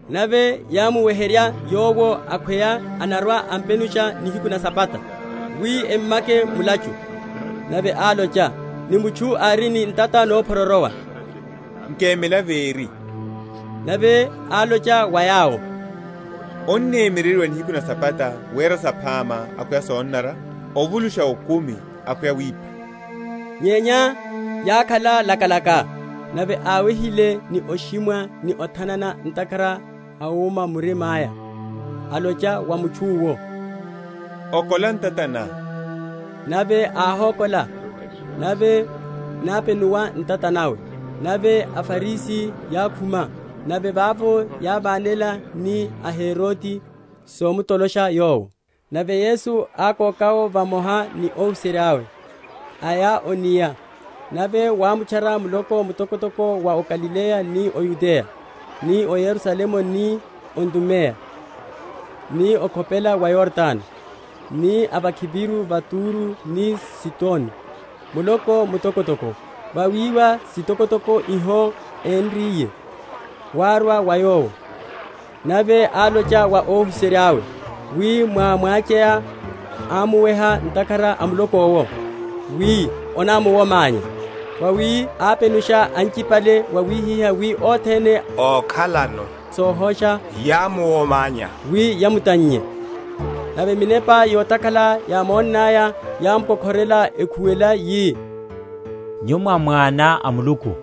Nave yámuweherya Yowo akhweya anarwa‐ampenusha nihiku na Sabata; wi emmake mulachu. Nave álocha ni mutchu ári ni ntata nóphyororowa, Nkemela véri. Nave álocha wa yawo, Onnemyereryiwa nihiku na Sabata wera saphama akhweya sonanara? ovulusha okumi akhweya wipha? Nyenya yákhala lakalaka. Nave áwehile ni oshimwa ni othanana ntakhara a wuma wa mirima’ya, álocha wa mutchu’wo, Okola ntata ná. Nave áhókola, nave nápenuwa ntata nawe. Nave aFarisi yákhuma nave vavo yávanela ni a Herode somtolosha Yowo. Nave Yesu ákoka’wo vamoha ni óhuserya’we, aya o’nia, nave wámutchara muloko mutokotoko wa o Galileya ni o Yudeya, ni o Yerusalemu ni o Idumeya, ni okhopela wa Yordano, ni a vakhiviru va Turo ni Sidoni, muloko mutokotoko, vawiwa sitokotoko iho énriye, wárwa wa Yowo. Nave álocha wa óhuserya’we wi mwá‐mwacheya amuwehe ntakhara a muloko’wo wi onamuwomanye. Vawi ápenusha anchipale wawihihá wi othene ókhalano sohosha yámuwomanya wi yamutannye. Nave minepa yotakhala, yámonaya, yámukokhorela ekhuwela, yi, Nyu mwá Mwana a Muluku.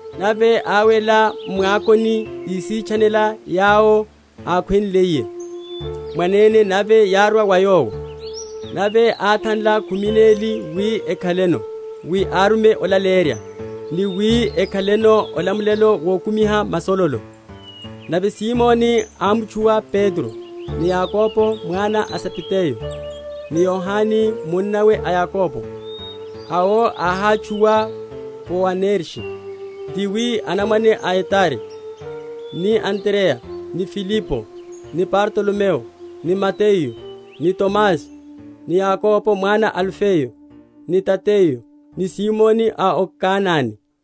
Nave áwela m’mwakoni, ísitchanela yawo ákhwenliye mwanene nave yárwa wa Yowo. Nave áthanla khumi neli wi ekhaleno, wi árume olaleyerya, ni wi ekhaleno olamulelo wokumiha masololo. Nave Simoni ámutchuwa Petro; ni Yakobo mwana a Zebedayo, ni Yohane munnawe a Yakobo, awo áhátchuwa Boanerge, ti wi anamwane a etari; ni Andreya ni Filipo, ni Bartolomeyo, ni Mateyu, ni Tomasi ni Yakobo mwana a Alifeyo, ni Tadeyo, ni Simoni a o Kanane,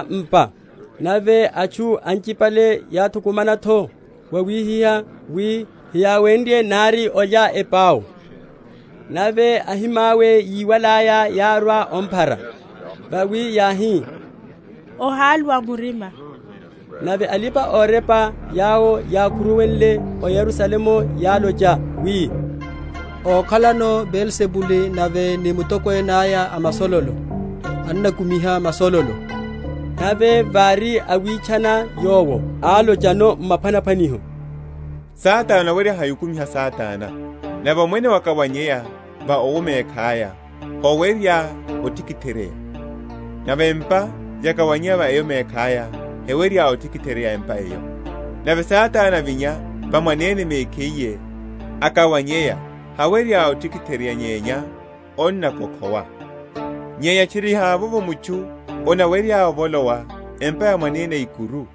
Nave ávolowa m’pa. Nave atchu anchipale yáthukumana’tho wawihihá wi heyáwenrye nari olya epau. Nave ahimawe yíwalaya, yárwa omphara; vawi yáhi, Ohaluwa murima. Nave alipa‐orepa yawo yákhuruwale o Yerusalemu yálocha wi, Ókhalano Beelzibule nave ni mutokwene aya a masololo, annakumiha masololo. Nave vári áwitchana yawo, álochano m’maphwanaphwaniho, Satana anawerye hai okumiha Satana? Nave omwene wakawaneya va owo mekhaya, howerya otikitheryeya. Nave empa yakawaneya va eyo mekhaya hewerya otikitheryeya empa eyo. Nave Satana avinya va mwanene mekhiye, akawaneya, hawerya otikitheryeya nyenya anakokhowa. Nyenya tchiri havovo mutchu anawerya ovolowa empa ya mwanene ikuru,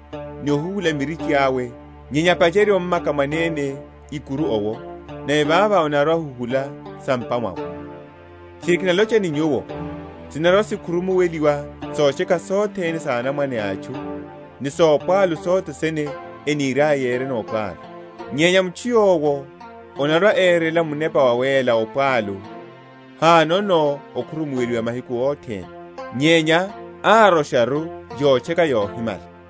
ni ohuhula mirichi awe, nyenya apacherye ommaka mwanene ikuru yowo, nave vavo anarwa‐ahuhula sa m’pa mwawe. Tchiri kinalocha ni nyuwo, Sinarwa‐sikhurumuweliwa sotcheka sothene sa anamwane a atchu ni sopwalu sothene eniriaya yereno opwalu; nyenya mutchu yowo anarwa‐erela Munepa Wawéla opwalu hanono okhurumuweliwa mahiku othene, nyenya árosharu yotcheka yohimala;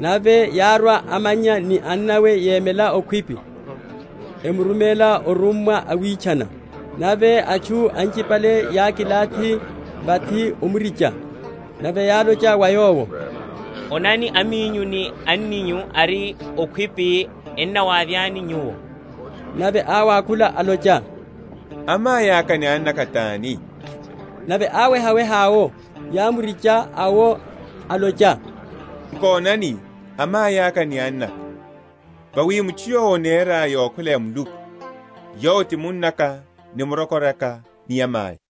Nave yárwa amannya ni annawe yemela okhwipi, emurumela órummwa omwitchana. Nave atchu anchipale yákilathi vathi omricha; nave yálocha wa Yowo, Onani, aminyu ni anninyu ari okhwipi ennawavyani Nyuwo. Nave áwakhula, alocha, Amaiaka ni annaka tani? Nave áwehaweha awo yámurinche awo alocha, Nkonani amai aka ni annaka. Vawi mutchu yowo anera yokhwela ya Muluku, yowo ti munnaka, ni murokora, ni amai.